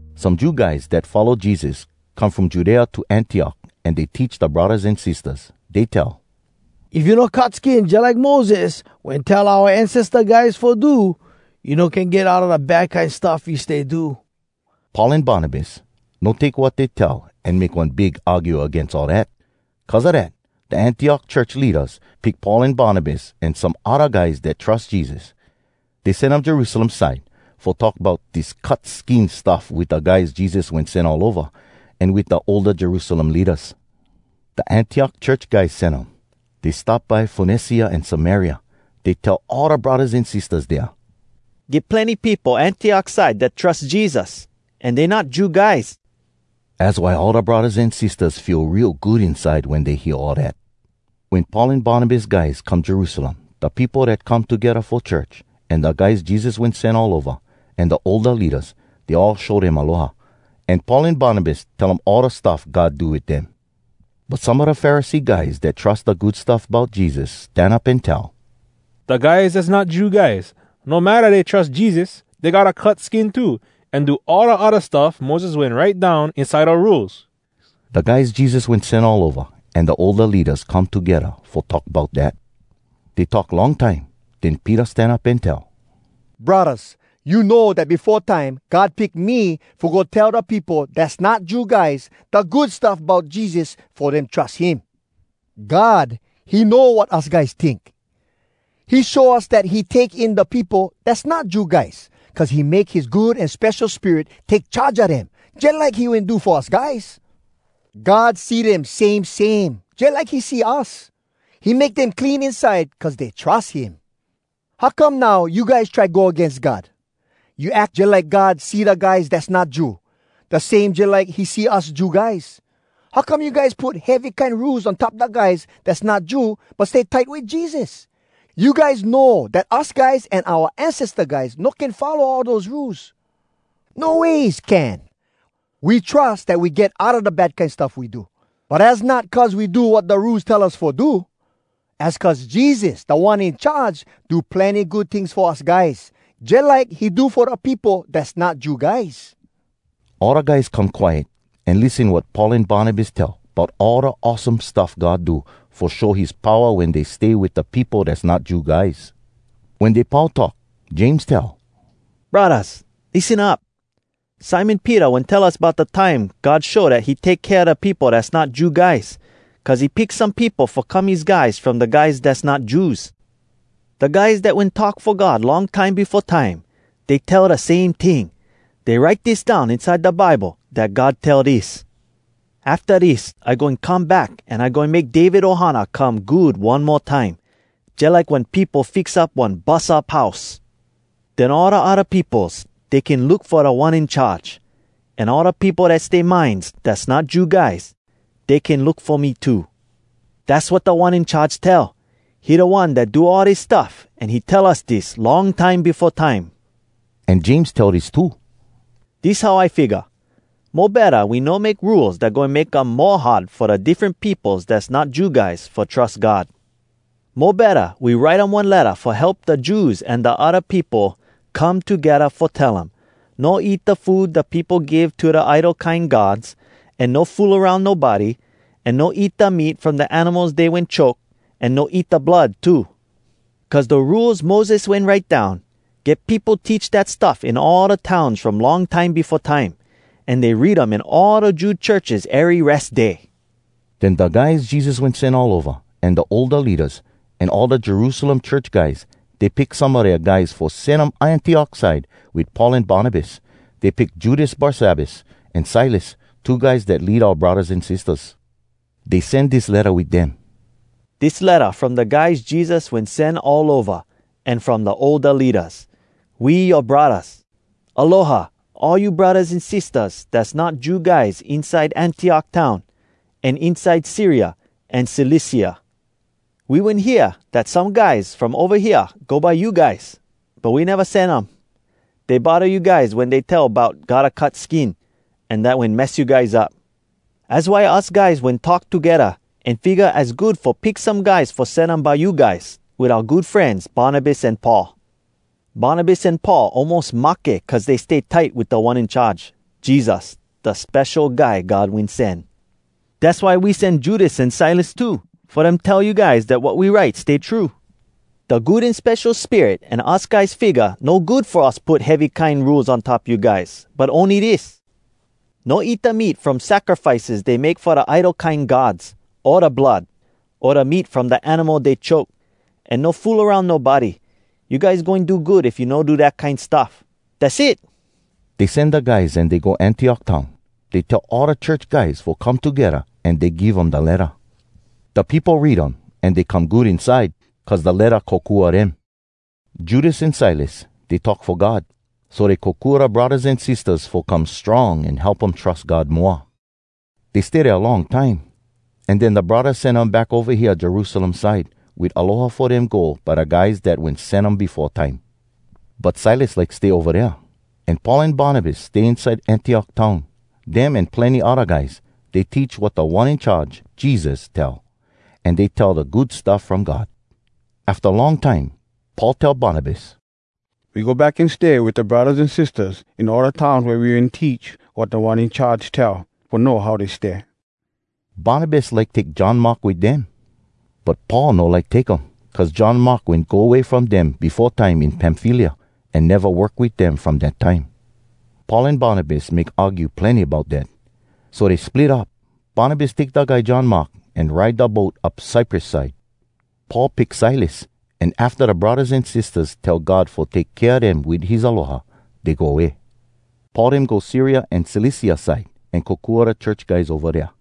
Some Jew guys dat follow Jesus come from Judea to Antiok an dey teach da braddahs an sistahs. Dey tell, “If you no cut skin jalike Moses wen tell oua ancesta guys fo do, you no can get outa da bad kine stuff you stay do.” Paul an Barnabas no take wat dey tell an make one big argue agains all dat. Cuz a dat, da Antiok church leadas pick Paul an Barnabas an some odda guys dat trus Jesus. Dey sen um Jerusalem side fo talk bout dis cut skin stuff wit da guys Jesus wen sen all ova, an wit da older Jerusalem leadas. Da Antiok church guys sen um. Dey stop by Fonecia an Samaria. Dey tell all da braddahs an sistahs dea, “Get plenny peopo Antiok side dat trus Jesus, an dey not Jew guys.” Az why all da braddahs an sistahs feel real good inside wen dey hear all dat. Wen Paul an Barnabas guys come Jerusalem, da peopo dat come togedda fo church, an da guys Jesus wen sen all ova, an da older leadas, dey all show dem aloha. An Paul an Barnabas tell um all da stuff God do wit dem. But some a da Pharisee guys dat trus da Good Stuff Bout Jesus stan up an tell, “Da guys dass not Jew guys, no matta dey trus Jesus, dey gotta cut skin too an do all da odda stuff Moses wen write down inside da Rules.” Da guys Jesus wen sen all ova an da older leadas come togedda fo talk bout dat. Dey talk long time. Den Peter stan up an tell, “Braddahs, you know dat befo time God pick me fo go tell da peopo dass not Jew guys da Good Stuff Bout Jesus fo dem trus him. God, he know wat us guys tink. He show us dat he take in da peopo dass not Jew guys, cuz he make his Good An Spesho Spirit take charge a dem, jalike he wen do fo us guys. God see dem same same jalike he see us. He make dem clean inside cuz dey trus him. How come now you guys try go agains God?! You ack jalike God see da guys dass not Jew, da same jalike he see us Jew guys? How come you guys put heavy kine rules on top da guys dass not Jew but stay tight wit Jesus? You guys know dat us guys an oua ancesta guys no can follow all dose rules. No ways can! We trus dat we get outa da bad kine stuff we do, but az not cuz we do wat da Rules tell us fo do. Az cuz Jesus, Da One In Charge, do plenny good tings fo us guys, jalike he do fo da peopo dass not Jew guys.” All da guys come quiet an lissen wat Paul an Barnabas tell bout all da awesome stuff God do fo show his powa wen dey stay wit da peopo dass not Jew guys. Wen dey pau talk, James tell, “Braddahs, lissen up. Simon Peter wen tell us bout da time God show dat he take kea da peopo dass not Jew guys, cuz he pick some peopo fo come his guys from da guys dass not Jews. Da guys dat wen talk fo God long time befo time, dey tell da same ting. Dey write dis down inside da Bible dat God tell dis: “‘Afta dis I goin come back An I goin make David ohana come good one mo time, Jalike wen peopo fix up one bus up house. Den all da odda peopos, Dey can look fo Da One In Charge, An all da peopo dat stay mines Dass not Jew guys, Dey can look fo me too. Dass wat Da One In Charge tell, He da One dat do all dis stuff An he tell us dis long time befo time.’” An James tell dis too: “Dis how I figga. Mo betta we no make rules dat goin make um mo hard fo da diffren peopos dass not Jew guys fo trus God. Mo betta we write um one letta fo help da Jews an da odda peopo come togedda fo tell um: No eat da food da peopo give to da idol kine gods, an No fool aroun nobody, an No eat da meat from da animals dey wen choke, an No eat da blood too. “Cuz da Rules Moses wen write down, get peopo teach dat stuff in all da towns from long time befo time, an dey read um in all da Jew churches ery Res Day.” Den da guys Jesus wen sen all ova, an da older leadas, an all da Jerusalem church guys, dey pick some a dea guys fo sen um Antiok side wit Paul an Barnabas. Dey pick Judas Barsabbas, an Silas, two guys dat lead oua braddahs an sistahs. Dey sen dis letta wit dem: “Dis letta from da guys Jesus wen sen all ova, an from da older leadas. We yoa braddahs. Aloha, all you braddahs an sistahs dass not Jew guys inside Antiok town, an inside Syria an Cilicia. We wen hear dat some guys from ova hea go by you guys, but we neva sen um. Dey bodda you guys wen dey tell bout gotta cut skin. An dat wen mess you guys up. “Az why us guys wen talk togedda, an figga az good fo pick some guys fo sen um by you guys, wit oua good frenz Barnabas an Paul. Barnabas an Paul almos mahke cuz dey stay tight wit Da One In Charge, Jesus, da Spesho Guy God Wen Sen. Dass why we sen Judas an Silas too, fo dem tell you guys dat wat we write stay true. “Da Good An Spesho Spirit an us guys figga no good fo us put heavy kine rules on top you guys, but ony dis: No eat da meat from sacrifices dey make fo da idol kine gods, o da blood, o da meat from da animal dey choke, an no fool aroun nobody. You guys goin do good if you no do dat kine stuff. “Dass it!” Dey sen da guys an dey go Antiok town. Dey tell all da church guys fo come togedda an dey give um da letta. Da peopo read um an dey come good inside, cuz da letta kokua dem. Judas an Silas, dey talk fo God. So dey kokua da braddahs an sistahs fo come strong an help um trus God moa. Dey stay dea long time, an den da braddahs sen um back ova hea Jerusalem side wit aloha fo dem go by da guys dat wen sen um befo time. [But Silas like stay ova dea.] An Paul an Barnabas stay inside Antiok town. Dem an plenny odda guys, dey teach wat Da One In Charge, Jesus, tell, an dey tell da Good Stuff From God. Afta long time Paul tell Barnabas, “We go back an stay wit da braddahs an sistahs in all da towns wea we wen teach wat Da One In Charge tell fo know how dey stay.” Barnabas like take John Mark wit dem. But Paul no like take um, cuz John Mark wen go way from dem befo time in Pamfylia, an neva work wit dem from dat time. Paul an Barnabas make argue plenny bout dat. So dey split up. Barnabas take da guy John Mark an ride da boat up Cyprus side. Paul pick Silas, an afta da braddahs an sistahs tell God fo take kea dem wit his aloha, dey go way. Paul dem go Syria an Cilicia side, an kokua da church guys ova dea.